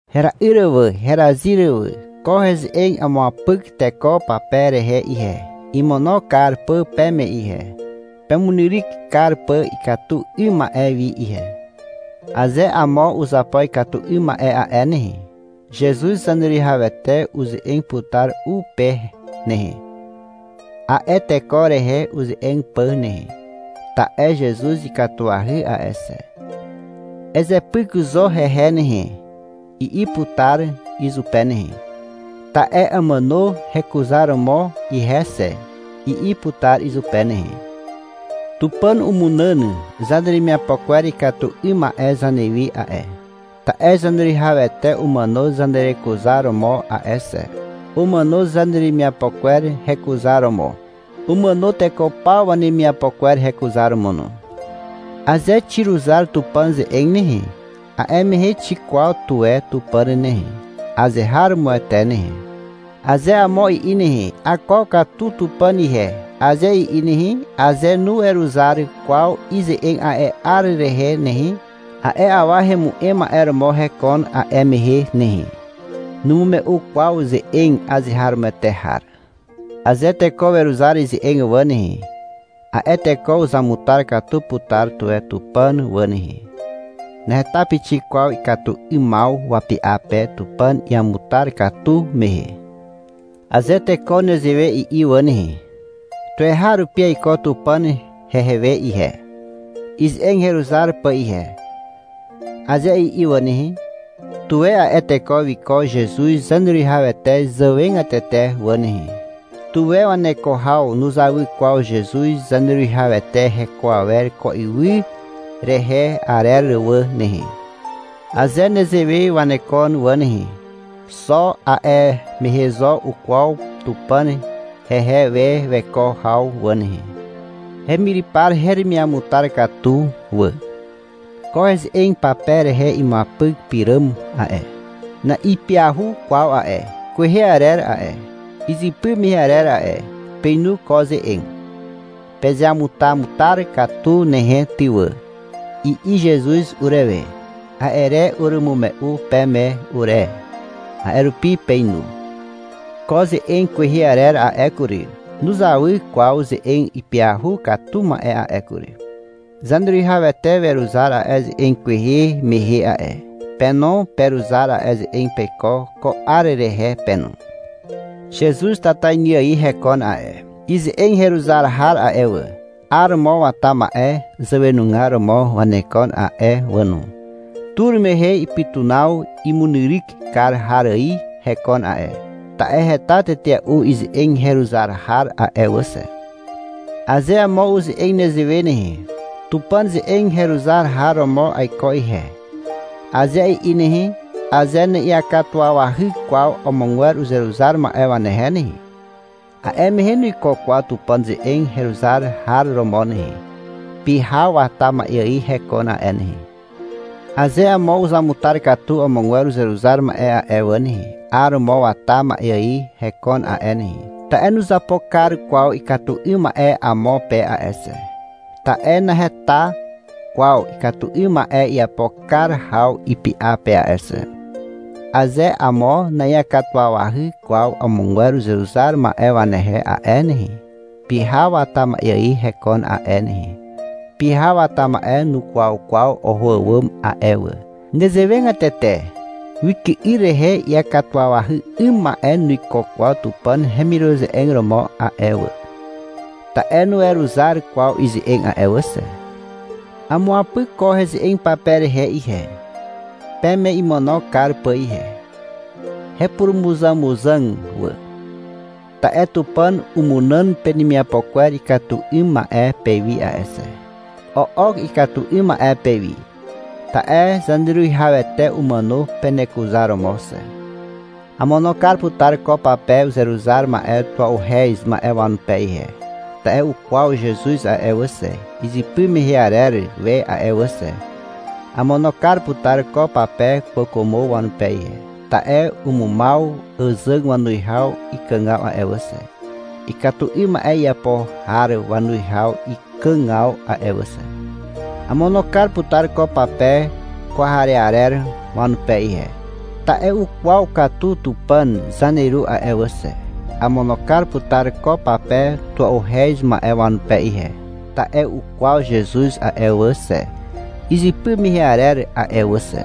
Hera'yr wà, herazyr wà. Ko heze'eg amuapyk teko pape rehe ihe, imono kar pà peme ihe, pemunyryk kar pà ikatu 'ym ma'e wi ihe. Aze amo uzapo ikatu 'ym ma'e a'e nehe, Zezuz Zaneruwihawete uze'eg putar u pe nehe, a'e teko rehe uze'eg pà nehe, ta'e Zezuz ikatuahy a'e xe. — Ezepyk zo hehe nehe, i'i putar izupe nehe. — Ta'e amàno hekuzaromo ihe xe, i'i putar izupe nehe. Tupàn umunàn zaneremiapo kwer ikatu 'ym ma'e zanewi a'e, ta'e Zaneruwihawete umàno zanerekuzaromo a'e xe. Umàno zaneremiapo kwer hekuzaromo. Umàno teko paw wanemiapo kwer hekuzaromo no. Aze xiruzar Tupàn ze'eg nehe, a'e mehe xikwaw tuwe Tupàn nehe, azeharomoete nehe. Aze amo i'i nehe, — Akwaw katu Tupàn ihe, aze i'i nehe, aze nuweruzar kwaw ize'eg a'e 'ar rehe nehe, a'e awa hemu'em ma'e romo hekon a'e mehe nehe. Numume'u kwaw ze'eg azeharomoete har. Aze teko weruzar ize'eg wà nehe, a'e teko uzamutar katu putar tuwe Tupàn wà nehe. (Naheta pixik kwaw ikatu 'ymaw wapy'a pe Tupàn iamutar katu mehe.) Aze teko nezewe i'i wà nehe, — Tuweharupi aiko Tupàn hehe we ihe, ize'eg heruzar pà ihe, aze i'i wà nehe, tuwe a'e teko wiko Zezuz Zaneruwihawete zàwegatete wà nehe, (tuwe waneko haw nuzawy kwaw Zezuz Zaneruwihawete heko awer ko ywy rehe arer wà nehe). Aze nezewe wanekon wà nehe, xo a'e mehe zo ukwaw Tupàn hehe we weko haw wà nehe. Hemyrypar heremiamutar katu wà. Ko ze'eg pape rehe imuapyk pyràm a'e, na'ipyahu kwaw a'e. Kwehe arer a'e. Izypy mehe arer a'e. Peinu ko ze'eg. (— Pezeamutamutar katu nehe ty wà, i'i Zezuz urewe. A'e re urumume'u peme ure. A'e rupi peinu.) Ko ze'eg kwehe arer a'e kury, nuzawy kwaw ze'eg ipyahu katu ma'e a'e kury. Zaneruwihawete weruzar a'e ze'eg kwehe mehe a'e. Pe no, peruzar a'e ze'eg peiko ko 'ar rehe pe no. Zezuz tatainy ài hekon a'e. Ize'eg heruzar har a'e wà, 'aromo wata ma'e zàwenugar romo wanekon a'e wà no. Tur mehe ipytunaw imunyryk kar har ài hekon a'e, ta'e heta tetea'u ize'eg heruzar har a'e wà xe. Aze amo uze'eg nezewe nehe. — Tupàn ze'eg heruzar har romo aiko ihe, aze i'i nehe, aze na'iakatuwawahy kwaw amogwer uzeruzar ma'e wanehe nehe, a'e mehe nuiko kwaw Tupàn ze'eg heruzar har romo nehe. Pyhaw wata ma'e ài hekon a'e nehe. Aze amo uzamutar katu amogwer uzeruzar ma'e a'e wà nehe, 'aromo wata ma'e ài hekon a'e nehe, ta'e nuzapo kar kwaw ikatu 'ym ma'e amo pe a'e xe, ta'e naheta kwaw ikatu 'ym ma'e iapo kar haw ipy'a pe a'e xe. Aze amo na'iakatuwawahy kwaw amogwer uzeruzar ma'e wanehe a'e nehe, pyhaw wata ma'e ài hekon a'e nehe. Pyhaw wata ma'e nukwaw kwaw oho àwàm a'e wà. Nezewegatete wyky'yr rehe iakatuwawahy 'ym ma'e nuiko kwaw Tupàn hemiruze'eg romo a'e wà, ta'e nuweruzar kwaw ize'eg a'e wà xe. Amuapyk ko heze'eg pape rehe ihe, peme imono kar pà ihe, hepurumuzàmuzàg wà, ta'e Tupàn umunàn penemiapo kwer ikatu 'ym ma'e pewi a'e xe. O'ok ikatu 'ym ma'e pewi, ta'e Zaneruwihawete umàno penekuzaromo xe. Amono kar putar ko pape uzeruzar ma'e tua'uhez ma'e wanupe ihe, ta'e ukwaw Zezuz a'e wà xe, izypy mehe arer we a'e wà xe. Amono kar putar ko pape kwàkwàmo wanupe ihe, ta'e umumaw àzàg wanuwihaw ikàgaw a'e wà xe, ikatu 'ym ma'e iapo har wanuwihaw ikàgaw a'e wà xe. Amono kar putar ko pape kwarearer wanupe ihe, ta'e ukwaw katu Tupàn zaneru a'e wà xe. Amono kar putar ko pape tua'uhez ma'e wanupe ihe, ta'e ukwaw Zezuz a'e wà xe, izypy mehe arer a'e wà xe.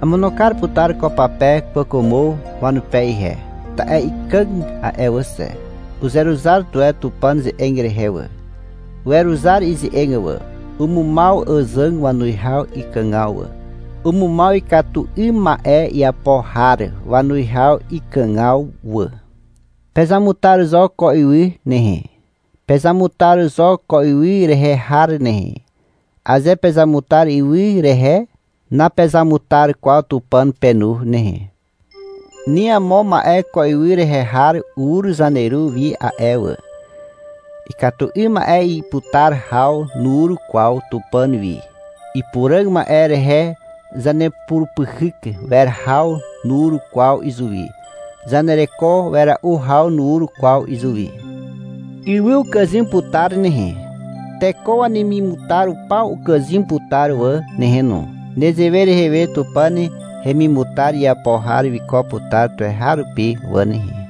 Amono kar putar ko pape kwàkwàmo wanupe ihe, ta'e ikàg a'e wà xe. Uzeruzar tuwe Tupàn ze'eg rehe wà. Weruzar ize'eg wà. Umumaw àzàg wanuwihaw ikàgaw wà, umumaw ikatu 'ym ma'e iapo har wanuwihaw ikàgaw wà. Pezamutar zo ko ywy nehe. Pezamutar zo ko ywy rehe har nehe. Aze pezamutar ywy rehe, napezamutar kwaw Tupàn penu nehe. Ni amo ma'e ko ywy rehe har ur Zaneru wi a'e wà. Ikatu 'ym ma'e iputar haw nur kwaw Tupàn wi. Ipuràg ma'e rehe zanepurupyhyk wer haw nur kwaw izuwi. Zanereko wera'u haw nur kwaw izuwi. Ywy ukàzym putar nehe. Teko wanemimutar paw ukàzym putar wà nehe no. Nezewe rehe we Tupàn hemimutar iapo har wiko putar tuweharupi wà nehe.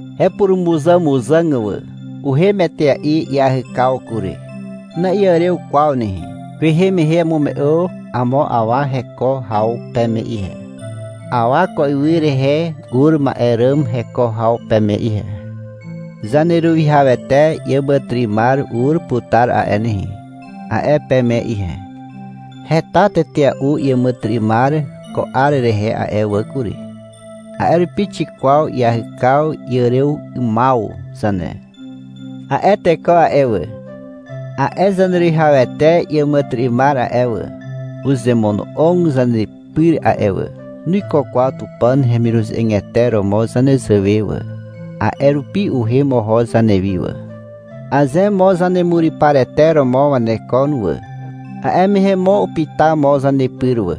Hepurumuzàmuzàg wà. Uhem etea'i iahykaw kury. Na'iàrew kwaw nehe. Kwehe mehe amume'u amo awa heko haw peme ihe, awa ko ywy rehe ur ma'e ràm heko haw peme ihe. — Zaneruwihawete iàmàtyry'ymar ur putar a'e nehe, a'e peme ihe. Heta tetea'u iàmàtyry'ymar ko 'ar rehe a'e wà kury. A'e rupi xikwaw iahykaw iàrew 'ymaw zane. A'e teko a'e wà, a'e Zaneruwihawete iàmàtyry'ymar a'e wà, uzemono'og zanepyr a'e wà. Nuiko kwaw Tupàn hemiruze'egete romo zanezàwe wà, a'e rupi uhem oho zanewi wà. Aze mo zanemuryparete romo wanekon wà, a'e mehe mo upyta mo zanepyr wà,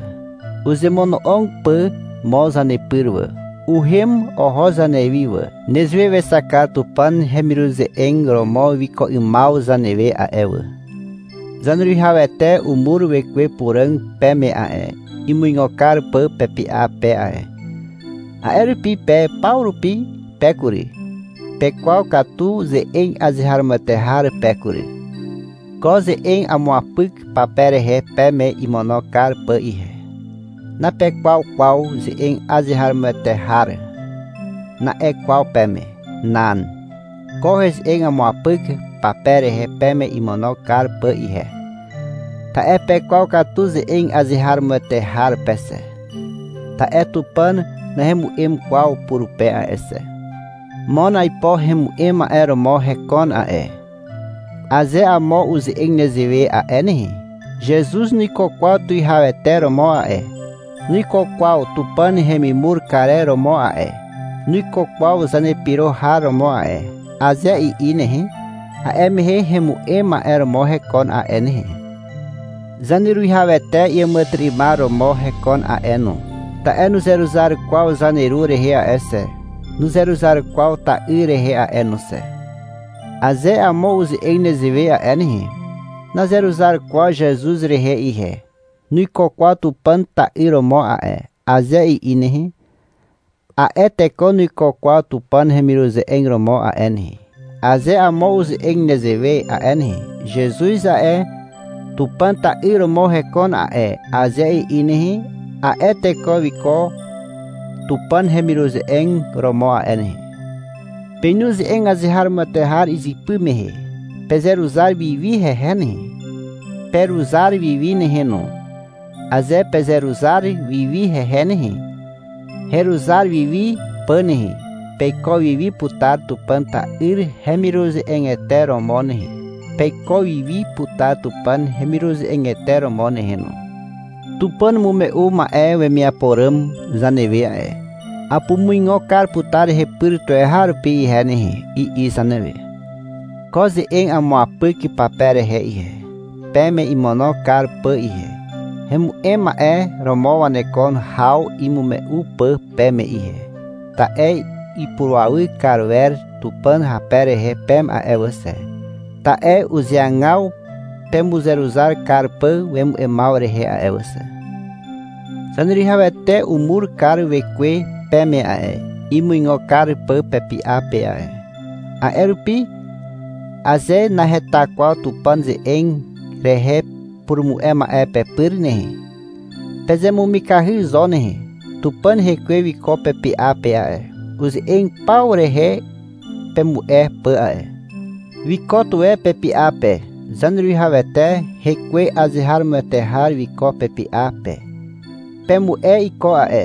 uzemono'og pà mo zanepyr wà. Uhem oho zanewi wà. Nezewe wexak kar Tupàn hemiruze'eg romo wiko 'ymaw zanewe a'e wà. Zaneruwihawete umur Wekwe Puràg peme a'e, imuigo kar pà pepy'a pe a'e. A'e rupi pe paw rupi pe kury, pekwaw katu ze'eg azeharomoete har pe kury. Ko ze'eg amuapyk pape rehe peme imono kar pà ihe. — Napekwaw kwaw ze'eg azeharomoete har, na'e kwaw peme. Nan. Ko heze'eg amuapyk pape rehe peme imono kar pà ihe, ta'e pekwaw katu ze'eg azeharomoete har pe xe. Ta'e Tupàn nahemu'em kwaw purupe a'e xe. Mon aipo hemu'em ma'e romo hekon a'e. Aze amo uze'eg nezewe a'e nehe, — Zezuz nuiko kwaw tuwihawete romo a'e, nuiko kwaw Tupàn hemimur karer romo a'e, nuiko kwaw zanepyro har romo a'e, aze i'i nehe, a'e mehe hemu'em ma'e romo hekon a'e nehe. Zaneruwihawete iàmàtyry'ymar romo hekon a'e no, ta'e nuzeruzar kwaw Zaneru rehe a'e xe. Nuzeruzar kwaw ta'yr rehe a'e no xe. Aze amo uze'eg nezewe a'e nehe, — Nazeruzar kwaw Zezuz rehe ihe. Nuiko kwaw Tupàn ta'yr romo a'e, aze i'i nehe, a'e teko nuiko kwaw Tupàn hemiruze'eg romo a'e nehe. Aze amo uze'eg nezewe a'e nehe, — Zezuz a'e, Tupàn ta'yr romo hekon a'e, aze i'i nehe, a'e teko wiko Tupàn hemiruze'eg romo a'e nehe. Peinu ze'eg azeharomoete har izypy mehe. Pezeruzar wiwi hehe nehe. Peruzar wiwi nehe no. Aze pezeruzar wiwi hehe nehe, heruzar wiwi pà nehe, peiko wiwi putar Tupàn ta'yr hemiruze'egete romo nehe. Peiko wiwi putar Tupàn hemiruze'egete romo nehe no. Tupàn umume'u ma'e wemiapo ràm zanewe a'e. — Apumuigo kar putar hepyr tuweharupi ihe nehe, i'i zanewe. Ko ze'eg amuapyk pape rehe ihe, peme imono kar pà ihe, hemu'em ma'e romo waneko haw imume'u pà peme ihe. Ta'e ipurawy kar wer Tupàn hape rehe peme a'e wà xe, ta'e uzeagaw pemuzeruzar kar pà wemu'emaw rehe a'e wà xe. Zaneruwihawete umur kar Wekwe peme a'e, imuigo kar pà pepy'a pe a'e. A'e rupi, aze naheta kwaw Tupàn ze'eg rehe purumu'e ma'e pepyr nehe, pezemumikahy zo nehe. Tupàn Hekwe wiko pepy'a pe a'e, uze'eg paw rehe pemu'e pà a'e. Wiko tuwe pepy'a pe. Zaneruwihawete Hekwe azeharomoete har wiko pepy'a pe. Pemu'e iko a'e.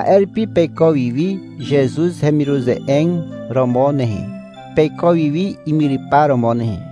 A'e rupi peiko wiwi Zezuz hemiruze'eg romo nehe, peiko wiwi imyrypar romo nehe.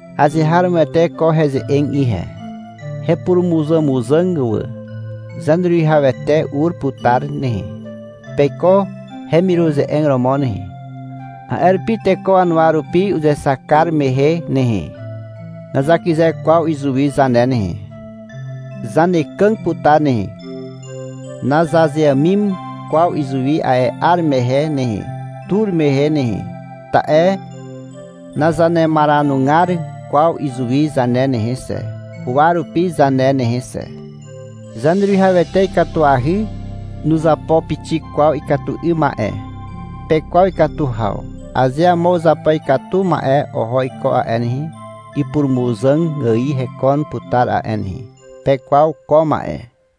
Azeharomoete ko heze'eg ihe, hepurumuzàmuzàg wà. Zaneruwihawete ur putar nehe. Peiko hemiruze'eg romo nehe. A'e rupi teko wanuwa rupi uzexak kar mehe nehe, nazakyze kwaw izuwi zane nehe. Zanekàg putar nehe. Nazazeàmim kwaw izuwi a'e 'ar mehe nehe, tur mehe nehe, ta'e nazanemaranugar kwaw izuwi zane nehe xe, huwa rupi zane nehe xe. Zaneruwihawete ikatuahy. Nuzapo pixik kwaw ikatu 'ym ma'e. Pekwaw ikatu haw. Aze amo uzapo ikatu ma'e oho iko a'e nehe, ipurumuzàg ài hekon putar a'e nehe. Pekwaw ko ma'e.